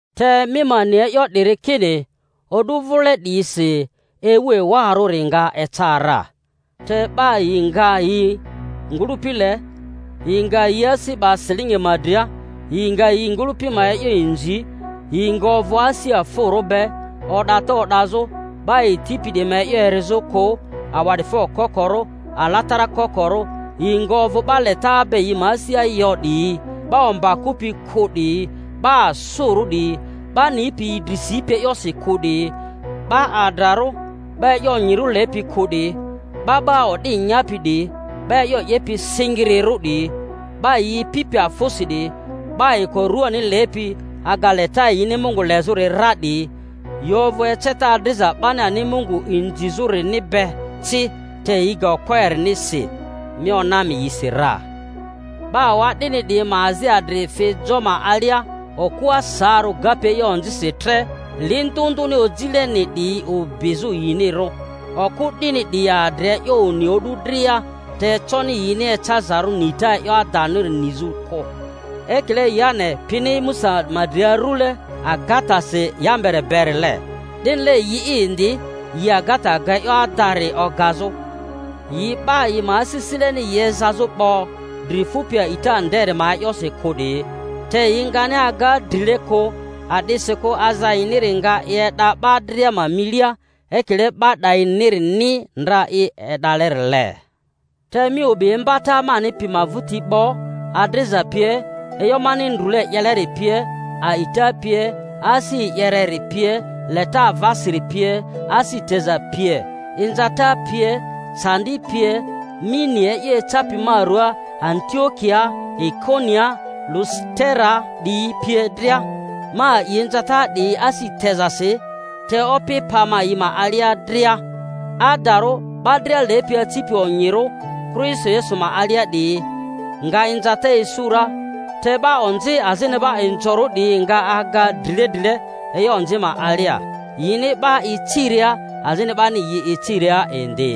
Te mi ma ni e'yo 'diri kini o'du vile 'diyisi ewu ewarᴜri nga eca ra. Te 'ba yi nga yi ngᴜlᴜpi le, yi nga yi asi 'ba silingi ma dria, yi nga yi ngᴜlᴜpi ma e'yo inzi, yi nga ovᴜ asi afᴜrᴜ be, o'data o'dazᴜ, 'ba yi tipi 'diyi ma e'yo erizᴜ kᴜ, awa'difo kokorᴜ, alatara kokorᴜ, yi nga ovᴜ 'ba leta be yi ma asia yo 'diyi, 'ba omba kᴜpi kᴜ 'diyi, 'ba asᴜrᴜ 'diyi, 'ba nipi yi dri sipi e'yosi kᴜ 'diyi, 'ba adrarᴜ, 'ba e'yo onyirᴜ lepi kᴜ 'diyi, 'ba 'ba o'di nyapi 'diyi, 'ba e'yo 'yepi singirirᴜ 'diyi, 'ba yi ipipi afᴜsi 'diyi, 'ba ayiko ruani lepi aga leta yini Mungu lezᴜri ra 'diyi; yi ovᴜ eceta adriza 'bani ani Mungu inzizᴜ-rini be ci, te yi ga okpo eriniri si. Mi ona mi yisi ra. 'Ba awa'dini 'diyi ma azi adri fi jo ma alia, okᴜa saarᴜ gapi e'yo onzisi tre, li ndᴜ ndᴜni ojileni 'diyi obizᴜ yinirᴜ; okᴜ 'dini 'diyi adri e'yo oni o'du dria, te econi yini ecazarᴜ nita e'yo adaniri nizᴜ kᴜ. Ekile Yane pini Musa ma dri arule agatasi Yambere berile, 'dinile yi'i indi yi agata ga e'yo adari ogazᴜ; yi 'ba yi ma asisile-ni yi ezazᴜ 'bo, dri fupi a'ita nderi ma e'yosi kᴜ 'diyi; te yi ngani aga drile kᴜ, a'disikᴜ aza yini nga i e'da 'ba dria ma milia, ekile 'ba 'dayinirini ndra i e'dalerile. Te mi obi imbata mani pi ma vᴜti 'bo, adriza pie, e'yo mani ndrule 'yeleri pie, a'ita pie, asi e'yereri pie, leta avasiri pie, asi teza pie, inza-ta pie, candi pie; mi ni e'yo ecapi ma ruaa Antiokiaa, Ikoniaa, Lusiteraa 'diyi pie dria; ma a'i inzata 'diyi asi tezasi; te Opi pa ma yi ma alia dria. Adarᴜ, 'ba dria lepi acipi onyirᴜ Kristo Yesu ma alia 'diyi nga inzata isu ra, te 'ba onzi azini 'ba inzorᴜ 'diyi nga aga drile drile e'yo onzi ma alia, yini 'ba iciria, azini 'bani yi iciria indi.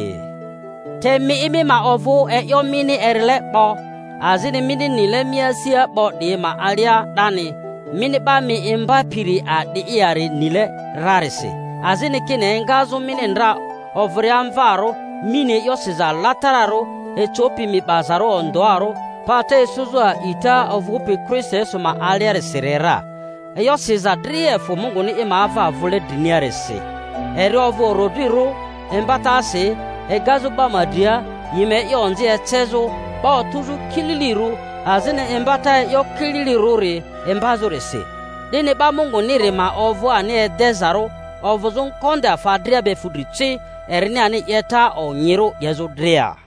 Te mi'i, mi ma ovᴜ e'yo mini erile 'bo azini mini nile mi asia 'bo 'diyi ma alia 'dani, mini 'ba mi imbapiri a'di'i yari nile rarisi; azini kini engazᴜ mini ndra ovᴜria mvarᴜ mi ni e'yo siza alatararᴜ ecopi mi 'bazarᴜ ondᴜarᴜ pata isuzᴜ a'ita ovᴜpi Kristo Yesu ma aliarisiri ra. E'yo siza dria efᴜ Munguni i ma ava vule driniarisi, eri ovᴜ orodrirᴜ imbatasi, egazᴜ 'ba ma dria yi ma e'yo onzi ecezᴜ, 'ba otᴜzᴜ kililirᴜ, azini imbata e'yo kililirᴜri imbazᴜrisi, 'dini 'ba Munguniri ma ovᴜ ani edezarᴜ ovᴜzᴜ ngonde afa dria be fudri ci, erini ani 'yeta onyirᴜ 'yezᴜ dria.